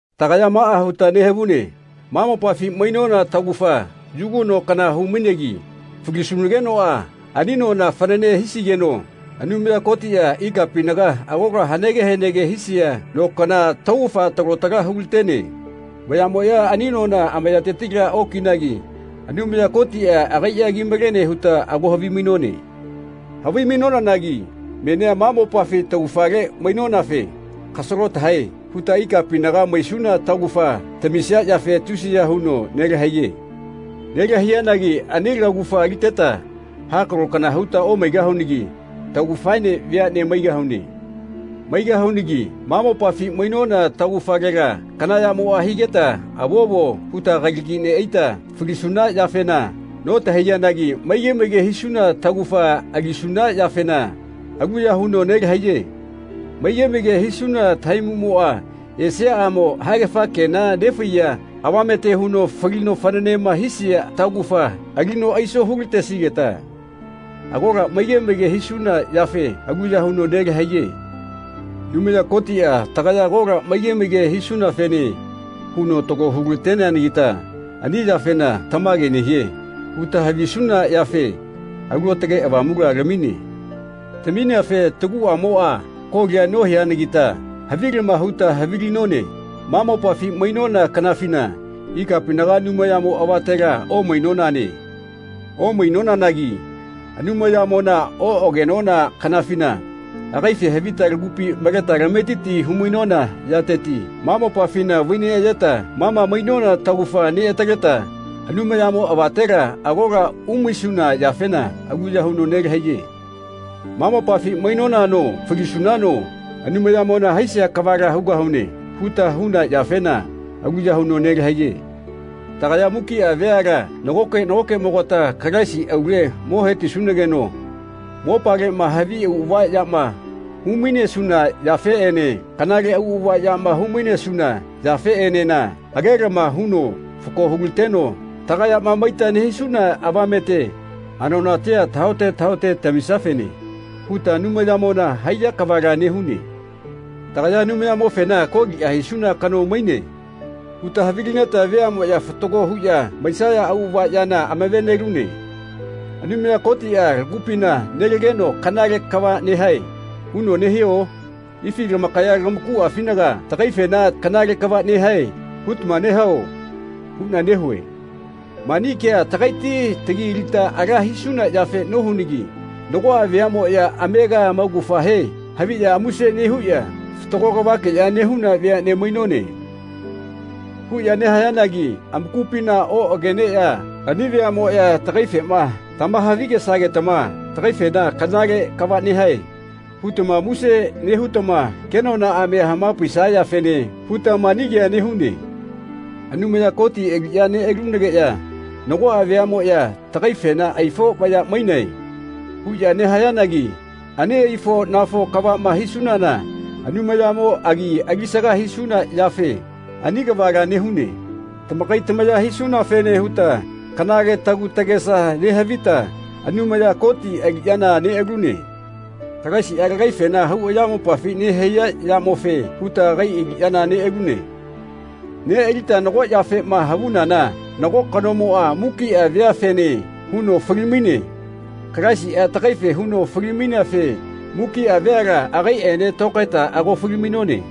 Tagaya maꞌa huta nehavune ma mopafi mainona taugafa yugu no kana hu-mainegi falisunagenoꞌa ani nona fanane hisigeno Anumaya Kotiꞌa ikapinaga agola hanege hanege hisia no kana taugafa talo tala hulatene. Vayaꞌmoꞌya ani nona amayatetila okinagi Anumaya Kotiꞌa agaiꞌa kimalene huta ago havimainone. Havimainonanagi menia ma mopafi taugafale mainonafe “Kasalo tahae.” huta ikapinaga maisuna taugafa tamisia yafe tusiya huno nelahaiye. Nelahaiyanagi ani laugafa aliteta hakalo kana huta omaigahunagi taugafaene veaꞌne maigahune. Maigahunagi ma mopafi mainona taugafalela kana yamo higeta “Avovo.” huta kalagila neꞌaita falisuna yafena notahaiyanagi maige maige hisuna taugafa alisuna yafena aluya huno nelahaiye. Maige maige hisuna tahaimuꞌmoꞌa esiaꞌamo haegafa kenama nefaiya avamete huno falino fananema hisia taugafa alino aiso hulatesigeta agola maige maige hisuna yafena aluya huno nelahaiye. Anumaya Kotiꞌa tagaya agola maige maige hisunafene huno talo hu lateneanagita ani yafena “Tamage nehie.” huta havisuna yafe Alu Aotage Avamula lamine. Tamineafe taguꞌamoꞌa kolia nohianagita havilama huta havilinone ma mopafi mainona kanafina ikapinaga Anumayamo avatela omainonane. Omainonanagi Anumayamona oꞌagenona kanafina agaife havita lagupi maleta lametiti hu-mainona yateti ma mopafina vaineꞌayeta ma ma mainona taugafa neꞌataleta Anumayamo avatela agola umaisuna yafena aluya huno nelahaiye. “Ma mopafi mainonano falisunano Anumayamona haisia kavala hugahune.” huta huna yafena aluya huno nelahaiye. Tagaya mukiꞌa veala nagoke nagokeꞌmogata Kalaisi aule mo hetisunageno mopaleꞌma havi auꞌava yama humainesuna yafeꞌene kanale auꞌava yama hu-mainesuna yafeꞌenena agelama huno fako hulateno tagayama maita nehisuna avamete anonatia tahaote tahaote tamisiafene huta Anumayamona haiya kavala nehune. Tagaya Anumayamofena “Koliꞌa hisuna kano maine.” huta havilineta veaꞌmoꞌya fatago huꞌya maisaya auꞌava yana amave-nelune. Anumaya Kotiꞌa lagupina nelageno “Kanale kava nehae.” huno nehio? Ifi tamakaya tamakuꞌafinaga tagaifena “Kanale kava nehae.” hutama nehao? huꞌna nehue. Mani kea tagaiti lagi alita ala hisuna yafe nohunagi nagoꞌa veaꞌmoꞌya amega amaugafahe haviꞌya muse nehuꞌya “Fatago kavakeꞌya nehuna veaꞌne mainone.” huꞌya nehayanagi amakupina oꞌageneꞌya ani veaꞌmoꞌya tagaifema tamahavi-gesagetama tagaifena “Kanale kava nehae.” hutama muse nehutama kenonaꞌamia hamapaisayafene huta mani kea nehune. Anumaya Koti aliꞌya neꞌalunageꞌya nagoꞌa veaꞌmoꞌya tagaifena “Aifo vaya mainae.” huꞌya nehayanagi ani aifo-nafo kavaꞌma hisunana Anumayamo agi alisaga hisuna yafe ani kavala nehune. Tamakai tamaya hisunafene huta kanale tagu tagesa nehavita Anumaya Koti aliꞌyana neꞌalune. Kalaisiꞌa lagaifena hau ayamopafima nehaiya yamofe huta agai aliꞌyana neꞌalune. Neꞌalita nago yafema havunana nago kanomoꞌa mukiꞌa veafene huno fali-maine. Kalaisiꞌa tagaife huno fali-maineafe mukiꞌa veala agaiꞌene tokaeta ago fali-mainone.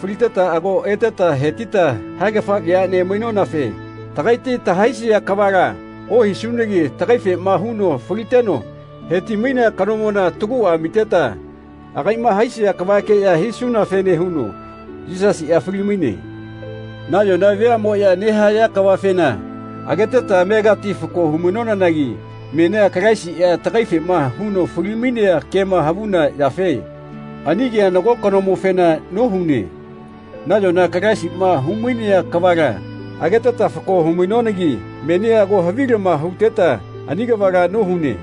Faliteta ago eteta hetita haegafa veaꞌne mainonafe tagaiti tahaisia kavala ohisunagi tagaifema huno faliteno heti-mainea kanomona taguꞌa amiteta agaiꞌma haisia kavakeꞌya hisunafene huno Yisasiꞌa fali-maine. Nayona veaꞌmoꞌya nehaya kavafena ageteta amegati fako humainonagi menia Kalaisiꞌa tagaifema huno fali-mainea kema havuna yafe ani kea nago kanomofena nohune. Nayona Kalaisiꞌma humainea kavala ageteta fako hu-mainonagi menia ago havilama huteta ani kavala nohune.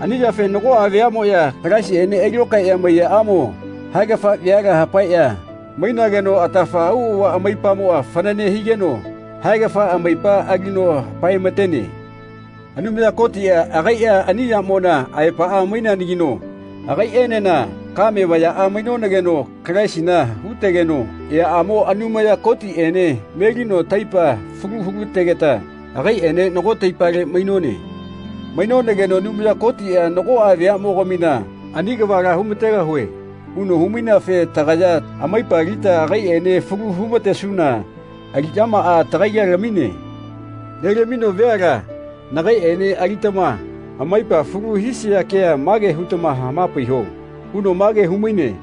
Ani yafe nagoꞌa veaꞌmoꞌya Kalaisiꞌene ailokaeꞌya maiyaꞌamo haegafa veala hapaeꞌya mainageno atafa auꞌava amaipamoꞌa fanane higeno haegafa amaipa alino hapaematene. Anumaya Kotiꞌa agaiꞌa ani yamona aepaꞌa maineanagino agaiꞌenena kame vayaꞌa mainonageno Kalaisina hutegeno eaꞌamo Anumaya Kotiꞌene melino taipa falu hulategeta agaiꞌene nago taipale mainone. Mainonageno Anumaya Kotiꞌa “Nagoꞌa veaꞌmogamina ani kavala humategahue.” huno humaineafe tagaya amaipa alita agaiꞌene falu humatesuna aliꞌyamaꞌa tagaila lamine. Nelamino “Veala nagaiꞌene alitama amaipa falu hisia kea mage hutama hamapaiho.” huno mage humaine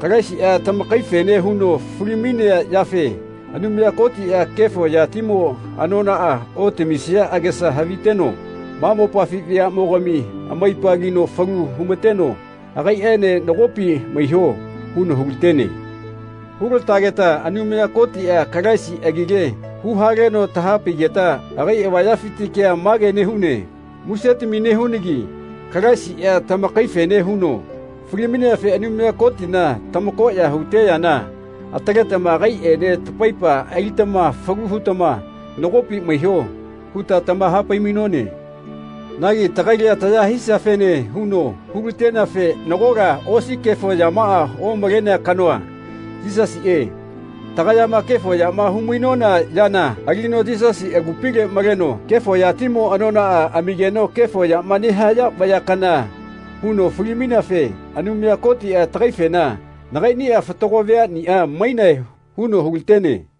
“Kalaisiꞌa tamakaifene huno fali-mainea yafe Anumaya Kotiꞌa kefo yatimo anonaꞌa otamisia agesa haviteno ma mopafi veaꞌmogami amaipa alino falu humateno agaiꞌene nagopi maiho.” huno hulatene. Hulategeta Anumaya Kotiꞌa Kalaisi agile huhaleno tahapaigeta agai avayafiti kea mage nehune “Musetami nehunagi Kalaisiꞌa tamakaifene huno fali-maineafe Anumaya Kotina tamakoꞌya hute yana ataletama agaiꞌene tamaipa alitama falu hutama nagopi maiho.” huta tamahapai-mainone. Nagi tagaila taya hisiafene huno hulateneafe nagola osi kefo yamaꞌa omalenea kanoa, Yisasiꞌe, tagayama kefo yama hu-mainona yana alino Yisasi agupile maleno kefo yatimo anonaꞌa amigeno kefo yama nehaya vaya kana huno fali-maineafe Anumaya Kotiꞌa tagaifena “Nagaiꞌniꞌa fatago veaꞌniꞌa mainae.” huno hulatene.